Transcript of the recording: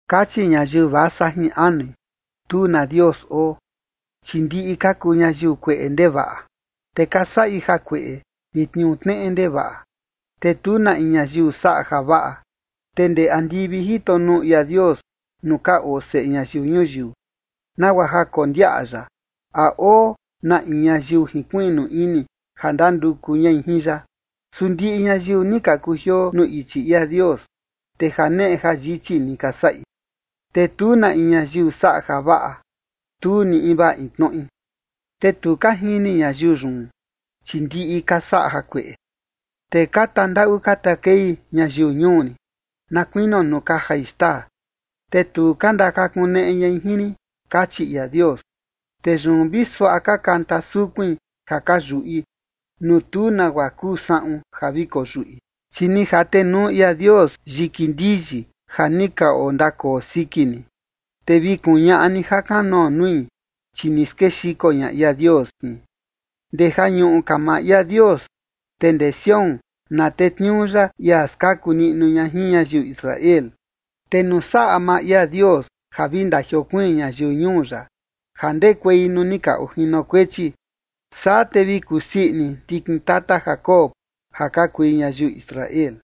Kachi ñayiu vasa jin anui: “Tu na Dios oo”. Chi ndiꞌi ka kuu ñayiu kueꞌe ndevaꞌa, te ka saꞌi jakueꞌe vi tniuu tneꞌe ndevaꞌa, te tu na in ñayiu saꞌa javaꞌa. Te ndee andivi jito nuu ia Dios nuu ka oo seꞌe ñayiu ñuyiu, nagua ja kondiaꞌa ya a oo na in ñayiu jinkuiꞌnu ini ja ndanduku ñai jin ya. Su ndiꞌi ñayiu ni ka kujioo nuu ichi ia Dios, te janeꞌe jayichi ni ka saꞌi, te tu na in ñayiu saꞌa javaꞌa, tu ni invaa in tnoꞌi. “Te tu ka jini ñayiu yun, chi ndiꞌi ka saꞌa jakueꞌe, te ka tandaꞌu ka takei ñayiu ñuu rin, na kuinio nuu ka jai xtaa, te tu ka ndakakuneꞌe ñai jin rin”, kachi ia Dios. Te yun vi suaꞌa ka kanta sukuin ja ka yuꞌi, nuu tu nagua kuu saꞌun ja vi koyuꞌi, chi ni jatenuu ia Dios yiki ndiyi ja ni ka ondakoo siki ni, te vi kuñaꞌa ni jakanoo nui, chi ni skexiko ña ia Dios jin. Ndee ja ñuꞌu ka maa ia Dios, te ndee Sión na tetniuu ya ia skaku niꞌnu ña jin ñayiu Israel. Te nuu saꞌa maa ia Dios ja vi ndajiokuiin ñayiu ñuu ya ja ndekuei nuu ni ka ojinokuechi, saa te vi kusii ini ndikin tata Jacob, ja ka kui ñayiu Israel.